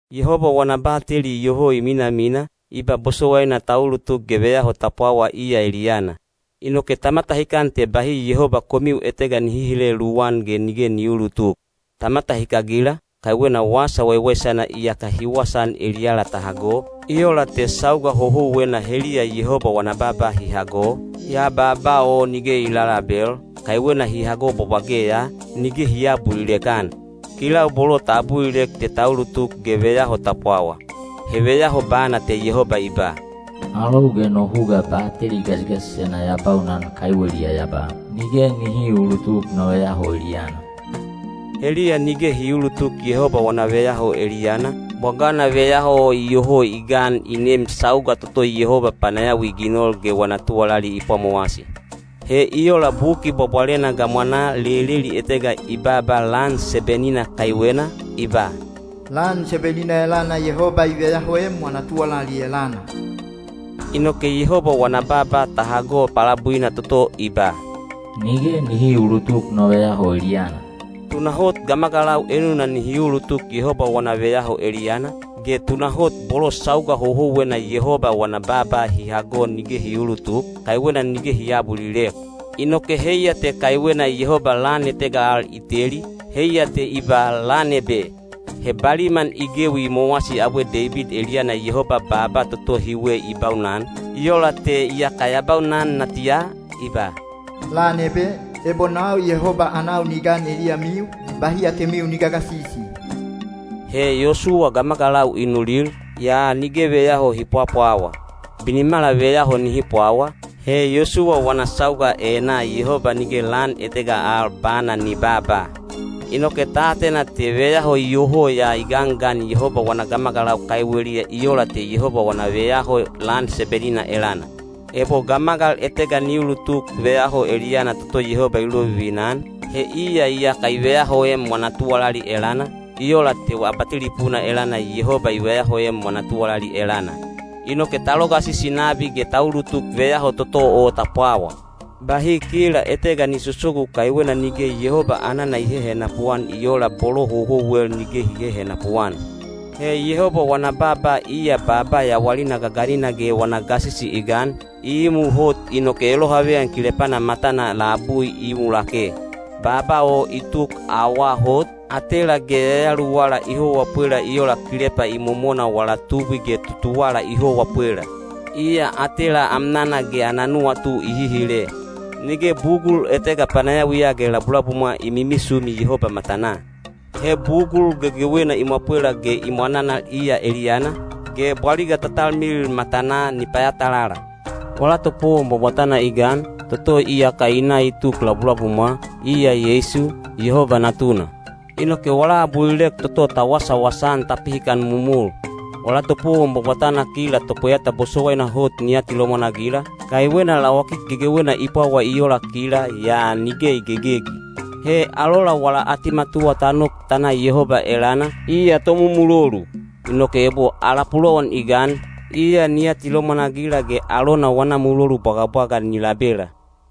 Yehoba wana bateli iyoho i minamina, i ba bosowaina ta ulutuk ge veyaho ta pwawa iya eliyana. Inoke ta matahikan te bahi Yehoba komiu etega ni hihile luwan ge nige ni uulutuk. Ta matahikagila, kaiwena Wasa Waiwaisana iyaka hi wasaan eliyala ta hago, i ola te sauga houhouwena heliya Yehoba wana baaba hi hago, yaa baaba o nige i lalabel, kaiwena hi hago bwabwage ya, nige hi aabulilek-an. Kilau bolo ta abulilek te ta ulutuk ge veyaho ta pwawa. He veyaho bana te Yehoba i ba: Alou ge no huga bateli gasigasisena ya baunan kaiweliya ya ba, “Nige nihi uulutuk no veyaho eliyana.” Heliya nige hi uulutuk Yehoba wana veyaho eliyana, bwagana veyaho o iyoho i gan i neem sauga toto Yehoba panayawi i ginol ge wana tuwalali i pwamowasi. He i ola Buki Bwabwalena gamwanaa leleli etega i baaba lan seben-ina kaiwena, i ba, “Lan seben-ina elana Yehoba i veyahoem wana tuwalali elana.” Inoke Yehoba wana baaba ta hago palabuina toto i ba, “Nige nihi uulutuk no veyaho eliyana.” Tunahot gamagalau enuna nihi ulutuk Yehoba wana veyaho eliyana, ge tunahot bolo sauga houhouwena Yehoba wana baaba hi hago nige hi uulutuk, kaiwena nige hi aabulilek. Inoke heiya te kaiwena Yehoba lan etega al i teli, heiya te i ba “lan ebe.” He baliman i gewi i mowasi abwe Deibid eliyana Yehoba baaba toto hiwe i baunan, i ola te iyaka ya baunan natiya, i ba: Lan ebe, ebo nau Yehoba anau ni gan eliyamiu, bahi atemiu ni gagasisi. He Yosuwa gamagalau i nulil, yaa nige veyaho hi pwapwawa. Binimala veyaho nihi pwawa, he Yosuwa wana sauga enaa Yehoba nige lan etega al bana ni babaa. Inoke ta atena te veyaho iyoho ya i gangan Yehoba wana gamagalau kaiweliya i ola te Yehoba wana veyaho lan seben-ina elana. Ebo gamagal etega ni ulutuk veyaho eliyana toto Yehoba i lovivina-an, he iya iyaka i veyahoem wana tuwalali elana, i ola te abatelipuna elana Yehoba i veyahoem wana tuwalali elana. Inoke ta logasisi nabi ge ta ulutuk veyaho toto o ta pwawa. Bahi kila etega ni sosogu kaiwena nige Yehoba anana i hehenapu-an i ola bolo houhouwel nige hi hehenapu-an. He Yehoba wana baaba iya baaba yawalina gaganina ge wana gasisi i gan, i imu hot inoke elohaveyan kilepana matana labui i imu lake. Baaba o i tuk awaa hot, atela ge yayaluwala i howa pwela i ola kilepa imomona wala tubwi ge tutuwala i howa pwela. Iya atela amnana ge ana nuwatu i hihile. Nige bugul etega panayawiya ge labulabumwa i mimisumi Yehoba matanaa. He bugul gegewena i mwapwela ge i mwananal iya eliyana, ge bwaliga ta talmilil matanaa ni payatalala. Wala topowon bwabwatana i gan, toto iyaka i na i tuk labulabumwa, iya Yeisu, Yehoba Natuna. Inoke wala abulilek toto ta wasawasa-an ta pihikan momol. Wala topowon bwabwatana kila topweyata bosowaina hot ni atilomwan-agila, kaiwena lawakik gegewena i pwawa i ola kila—yaa nige i gegegi. He alola wala atimatuwa ta nok ta na Yehoba elana, iya tomumulolu. Inoke ebo ala pulowan i gan, iya ni atilomwan-agila ge alona wana mulolu bwagabwaga ni labela.